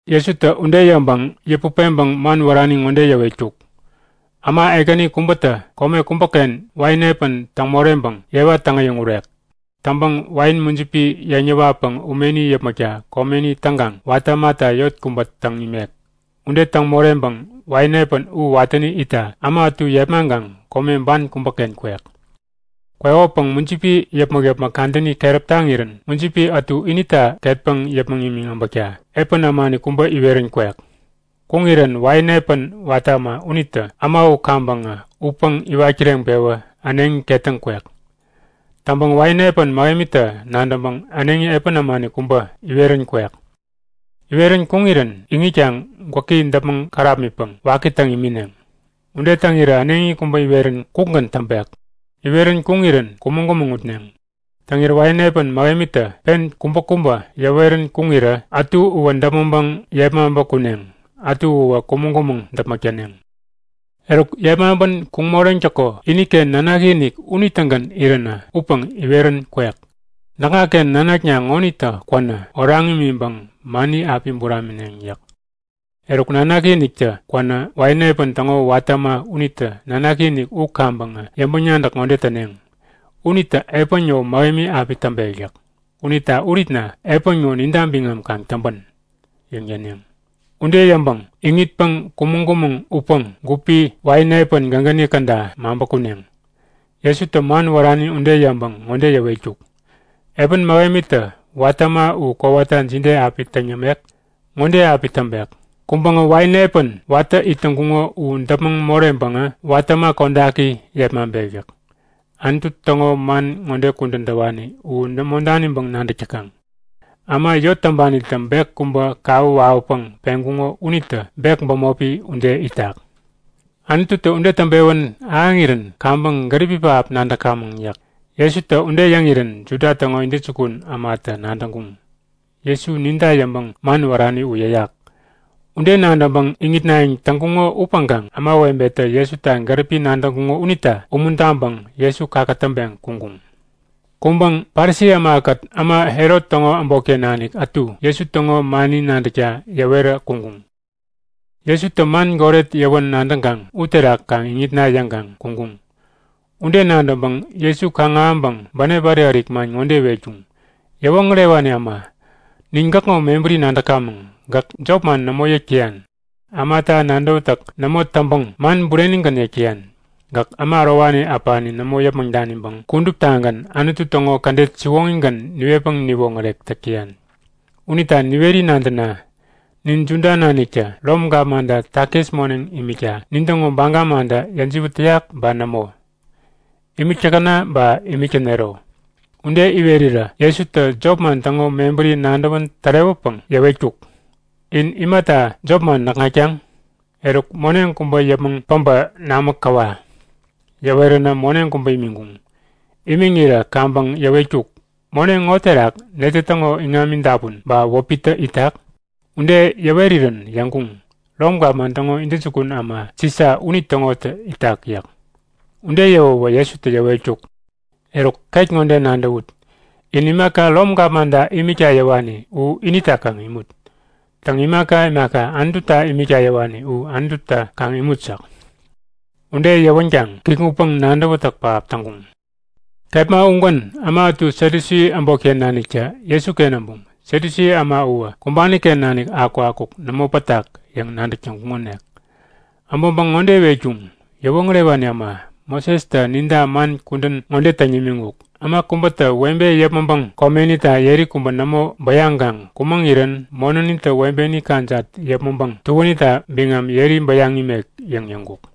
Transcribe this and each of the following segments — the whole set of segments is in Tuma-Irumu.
Jesutä ude yäŋpäŋ yäput peŋpäŋ man wärani ŋode yäwetkuk; Äma ekäni kubätä kome kubäken wain epän täŋ moreŋpäŋ yewa täŋ-äyäŋurek. Täŋpäŋ wain mujipi yeŋ yäwatpäŋ umeni yäpmäkta komeni täŋkaŋ watä ämata yot kubä täŋ imek. Ude täŋ moreŋpäŋ wain epän u watäni itta äma ätu yepmaŋkaŋ kome ban kubäken kwek. Kwekopäŋ mujipi yäpmäk-yäpmäk kadäni keräp taŋirän mujipi ätu inita ketpäŋ yäpmäŋ imiŋ äbäkta epän ämani kubä iwerän kwek. Kuŋirän wain epän watä äma unitä äma u kaŋpäŋä utpäŋ iwat kireŋpewä äneŋi ketäŋ kwek. Täŋpäŋ wain epän mähemitä nadäŋpäŋ äneŋi epän ämani kubä iwerän kwek. Iwerän kuŋirän iŋitkaŋ gwäki däpmäŋ kärapmitpäŋ waki täŋ imineŋ. Ude täŋirä äneŋi kubä iwerän kukgän täŋpek. Iwerän kuŋirän kumäŋ-kumäŋ utneŋ. Täŋirä wain epän mähemitä pen kubäkubä yäwerän kuŋirä ätu uwä däpmäŋpäŋ yepmaŋpä kuneŋ, ätu uwä kumäŋ-kumäŋ däpmäk täneŋ. Eruk, yepmaŋpän kuŋ moreŋtäko iniken nanaki-inik unitägän iränä upäŋ iwerän kwek. Näkŋaken nanakna ŋonitä kwänä oraŋ imiŋpäŋ mani api buramineŋ yäk. Eruk, nanaki-iniktä kwänä wain epän täŋo watä äma unitä nanaki-inik u kaŋpäŋä yäŋpäŋ-nadäk ŋode täneŋ; Unitä epän ŋo mähemi api täŋpek yäk. Unita uritna epän ŋo ninta biŋam kaŋ täŋpän! yäŋ yäneŋ. Ude yäŋpäŋ iŋitpäŋ kumäŋ-kumäŋ utpäŋ gupi wain epän gägäni käda maŋpä kuneŋ. Jesutä man wärani ude yäŋpäŋ ŋode yäwetkuk; Epän mähemitä watä äma u kowata jide api täŋ yämek? Ŋode api täŋpek; Kuŋpäŋä wain epän watä it täŋkuŋo u däpmäŋ moreŋpäŋä watä äma kodaki yepmaŋpek yäk. Anutu täŋo man ŋode kudän täwani u nämo daniŋpäŋ nadäk täkaŋ? Äma yot täŋpanitä bek kubä kawä wawäpäŋ peŋkuŋo unitä bek bämopi ude itak. Anututä ude täŋpewän ahäŋirän kaŋpäŋ gäripi pähap nadäkamäŋ yäk. Jesutä ude yäŋirän Juda täŋo intäjukun ämatä nadäŋkuŋ; Jesu ninta yäŋpäŋ man wärani u yäyak. Ude nadäŋpäŋ iŋitnayäŋ täŋkuŋo upäŋkaŋ ämawebetä Jesuta gäripi nadäk täŋkuŋo unita umuntaŋpäŋ Jesu kakätäŋpeŋ kuŋkuŋ. Kuŋpäŋ Parisi ämakät äma Herot täŋo äbotken nanik ätu Jesu täŋo mani nadäkta yäwerä kuŋkuŋ. Jesutä man goret yäwän nadäŋkaŋ uterak kaŋ iŋitna yäŋkaŋ kuŋkuŋ. Ude nadäŋpäŋ Jesu kaŋ-ahäŋpäŋ bänep ärik-ärik man ŋode iwetkuŋ; Yäwoŋärewani äma, nin gäkŋo mebäri nadäkamäŋ. Gäk jopman nämo yäk täyan. Ämata nadäwätäk nämo täŋpäŋ man burenigän yäk täyan. Gäk äma ärowani äpani nämo yäpmäŋ daniŋpäŋ kuduptagän Anutu täŋo kädet siwoŋigän niwetpäŋ niwoŋärek täk täyan. Unita niweri nadäna; Nin Juda naniktä Rom gapmanta takis moneŋ imikta nintäŋo baga mantä yäjiwät täyak ba nämo? Imik täkäna ba imik tänero? Ude iwerirä Jesutä jopman täŋo mebäri nadäwän tärewäpäŋ yäwetkuk; In imata jopman näkŋatkaŋ? Eruk moneŋ kubä yäpmäŋ päbä namä käwa. Yäweränä moneŋ kubä imiŋkuŋ. Imiŋirä kaŋpäŋ yäwetkuk; Moneŋ ŋo terak netä täŋo iŋami dapun ba wäpitä itak? Ude yäwerirän yäŋkuŋ; Rom gapman täŋo intäjukun äma Sisa unitäŋotä itak yäk. Ude yäwäwä Jesutä yäwetkuk; Eruk ket ŋode nadäwut; In imaka Rom gapmanta imikta yäwani u inita kaŋ imut. Täŋ, imaka imaka Anututa imikta yäwani u Anututa kaŋ imut yäk. Ude yäwänkaŋ kikŋutpäŋ nadäwätäk pähap täŋkuŋ. Kepma ugän äma ätu Satyusi äbotken naniktä Jesuken äbuŋ. (Satyusi äma uwä kumbani-ken nanik akukakuk nämo pätak yäŋ nadäk täŋkuŋonik.) Äbäŋpäŋ ŋode iwetkuŋ; Yäwoŋärewani äma, Mosestä ninta man kudän ŋode täŋ nimiŋkuk; Äma kubätä webe yäpmäŋpäŋ komenita yeri kubä nämo bäyaŋkaŋ kumäŋirän monänitä webeni kajat yäpmäŋpäŋ tuänita biŋam yeri bäyaŋ imek yäŋ yäŋkuk.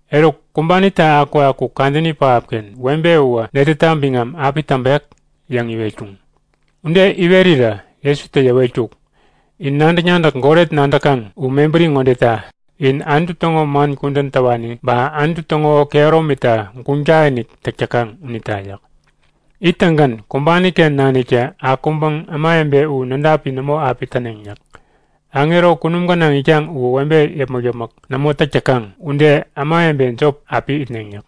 Eruk kumbanitä akukakuk kadäni pähapken webe uwä netäta biŋam api täŋpek? yäŋ iwetkuŋ. Ude iwerirä Jesutä yäwetkuk; In nadäk-nadäk goret nadäkaŋ u mebäri ŋodeta; In Anutu täŋo man kudän täwani ba Anutu täŋo kehäromita guŋ takinik täk täkaŋ unita yäk. Ittäŋgän kumbani-ken naniktä akuŋpäŋ ämawebe u nädapi nämo api täneŋ yäk. Aŋero kunum gänaŋ itkaŋ uwä webe yäpmäk-yäpmäk nämo täk täkaŋ ude ämawebe jop api itneŋ yäk.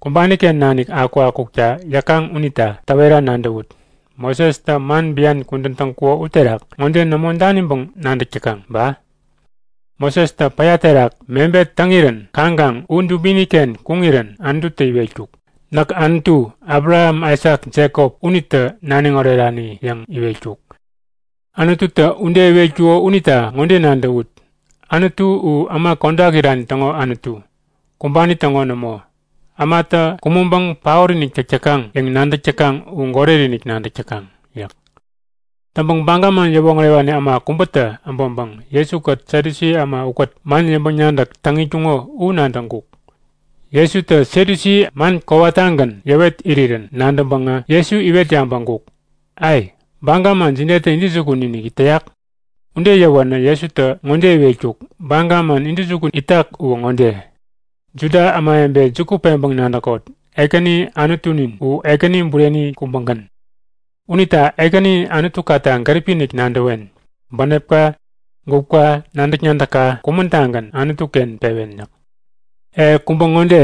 Kumbani-ken nanik akukakukta yäkaŋ unita täwera nadäwut; Mosestä man bian kudän täŋkuko uterak ŋode nämo daniŋpäŋ nadäk täkaŋ ba? Mosestä päya terak mebet täŋirän kaŋkaŋ u dubini-ken kuŋirän Anututä iwetkuk; Näk Anutu, Abraham, Aisak, Jekop unitä naniŋ orerani yäŋ iwetkuk. Anututä ude iwetkuko unita ŋode nadäwut; Anutu u äma kodak irani täŋo Anutu, kumbani täŋo nämo. Ämatä kumäŋpäŋ paot-inik täk täkaŋ yäŋ nadäk täkaŋ u goret-inik nadäk täkaŋ! yäk. Täŋpäŋ Baga man yäwoŋärewani äma kubätä äbäŋpäŋ Jesu-kät Satyusi äma ukät man yäŋpäŋ-nadäk täŋ itkuŋo u nadäŋkuk. Jesutä Satyusi man kowata tägagän yäwet irirän nadäŋpäŋä Jesu iwet yabäŋkuk; A, baga man jidetä intäjukun-inik täyak? Ude yäwänä Jesutä ŋode iwetkuk; Baga man intäjukun itak uwä ŋode; Juda ämawebe juku peŋpäŋ nadäkot! Ekäni Anutunin u Ekäni bureni kubägän. Unita Ekäni Anutukata gäripi-inik nadäwen. Bänepka, gupka, nadäk-nadäkka kumän-tagän Anutu-ken pewen yäk. E kubä ŋode;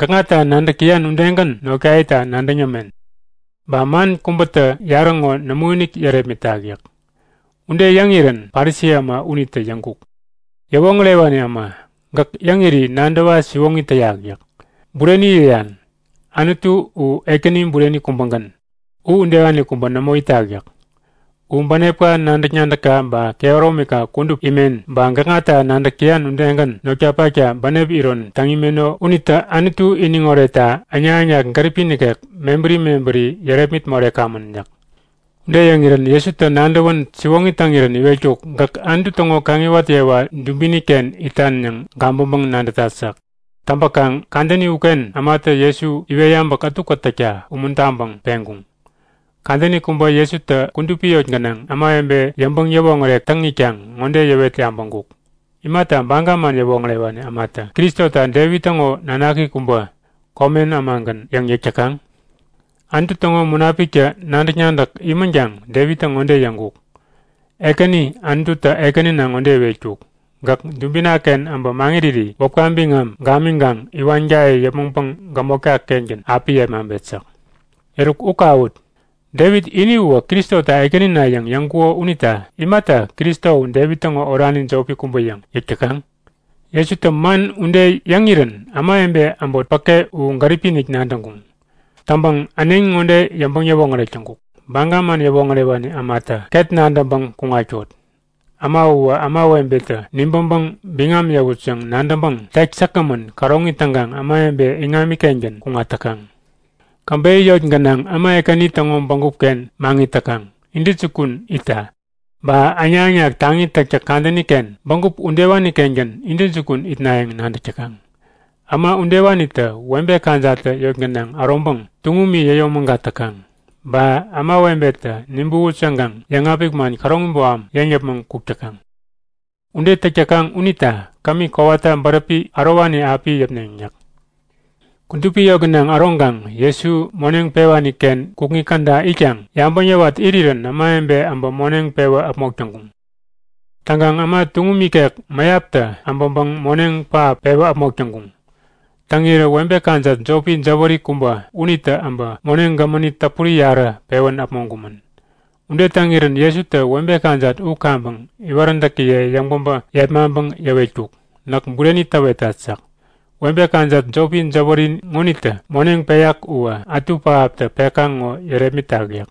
Gäkŋata nadäk täyan udegän notkayeta nadäŋ yämen. Baga man kubätä yarä ŋo nämoinik yärepmitak yäk. Ude yäŋirän Parisi äma unitä yäŋkuk; Yäwoŋärewani äma, gäk yäŋiri nadäwa siwoŋi täyak yäk. Bureni yäyan. Anutu u Ekäni bureni kubägän, u udewani kubä nämo itak yäk. U bänepka nadäk-nadäkka ba kehäromika kudup imen ba gäkŋata nadäk täyan udegän notkapakta bänep iron täŋ imeno unitä Anutu iniŋ oretta äŋnak-äŋnak gäripi nikek mebäri mebäri yärepmit morekamän yäk. Ude yäŋirän Jesutä nadäwän siwoŋi täŋirän iwetkuk; Gäk Anutu täŋo kaŋiwat yewa dubini-ken itan yäŋ gabäŋpäŋ-nadätat yäk. Täŋpäkaŋ kadäni uken ämatä Jesu iwet yabäk ätukät täkta umuntaŋpäŋ peŋkuŋ. Kadäni kubä Jesutä kudupi yot gänaŋ ämawebe yäŋpäŋ-yäwoŋärek täŋ itkaŋ ŋode yäwet yabäŋkuk; Imata Baga man yäwoŋärewani ämatä Kristota Devit täŋo nanaki kubä, komen ämagän yäŋ yäk täkaŋ? Anutu täŋo Munapiktä nadäk-nadäk imänkaŋ Devittä ŋode yäŋkuk; Ekäni Anututä Ekänina ŋode iwetkuk; Gäk dubina-ken äbä maŋiriri wäpka biŋam gamiŋkaŋ iwankaye yäpmäŋpäŋ gämotka-kengän api yepmaŋpet yäk. Eruk, u kawut! Devit ini uwä Kristota Ekänina yäŋ yäŋkuko unita imata Kristo u Devit täŋo orani jopi kubä yäŋ yäk täkaŋ? Jesutä man ude yäŋirän ämawebe äbot päke u gäripi-inik nadäŋkuŋ. Täŋpäŋ äneŋi ŋode yäŋpäŋ-yäwoŋäreŋkuk; Baga man yäwoŋärewani ämata ket nadäŋpäŋ kuŋatkot! Äma uwä ämawebetä nibäŋpäŋ biŋam yäwut yäŋ nadäŋpäŋ tek säkgämän käroŋi täŋkaŋ ämawebe iŋami-kengän kuŋat täkaŋ. Käbeyä yot gänaŋ äma ekäni täŋo bägup-ken maŋit täkaŋ, intäjukun itta. Ba äŋnak-äŋnak taŋi täktäk kadäni-ken bägup udewani-kengän intäjukun itnayäŋ nadäk täkaŋ. Äma udewanitä webe kajattä yot gänaŋ äroŋpäŋ tuŋumi yäyomägat täkaŋ. Ba ämawebetä nibäwut yäŋkaŋ yäŋapik man käroŋi boham yäŋ yäpmäŋ kuk täkaŋ. Ude täk täkaŋ unita kämi kowata bäräpi ärowani api yäpneŋ yäk. Kudupi yot gänaŋ äroŋkaŋ Jesu moneŋ pewani-ken kukŋi käda itkaŋ yabäŋ yäwat irirän ämawebe äbä moneŋ pewä äpmok täŋkuŋ. Täŋkaŋ äma tuŋum ikek mäyaptä äbäŋpäŋ moneŋ pähap pewä äpmok täŋkuŋ. Täŋirä webe kajat jopi jäwäri kubä unitä äbä moneŋ gämäni täpuri yarä pewän äpmoŋkumän. Ude täŋirän Jesutä webe kajat u kaŋpäŋ iwaräntäkiye yäŋ-päbä yepmaŋpäŋ yäwetkuk; Näk bureni täwetat yäk. Webe kajat jopi jäwäri ŋonitä moneŋ peyak uwä ätu pähaptä pekaŋ ŋo yärepmitak yäk.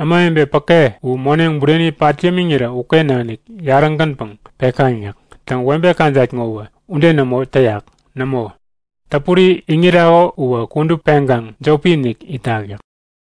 Ämawebe päke u moneŋ bureni pat yämiŋirä uken nanik yarä-gänpäŋ pekaŋ yäk. Täŋ, webe kajat ŋowä ude nämo täyak. Nämo, täpuri iŋirako uwä kudup peŋkaŋ jopi-inik itak yäk.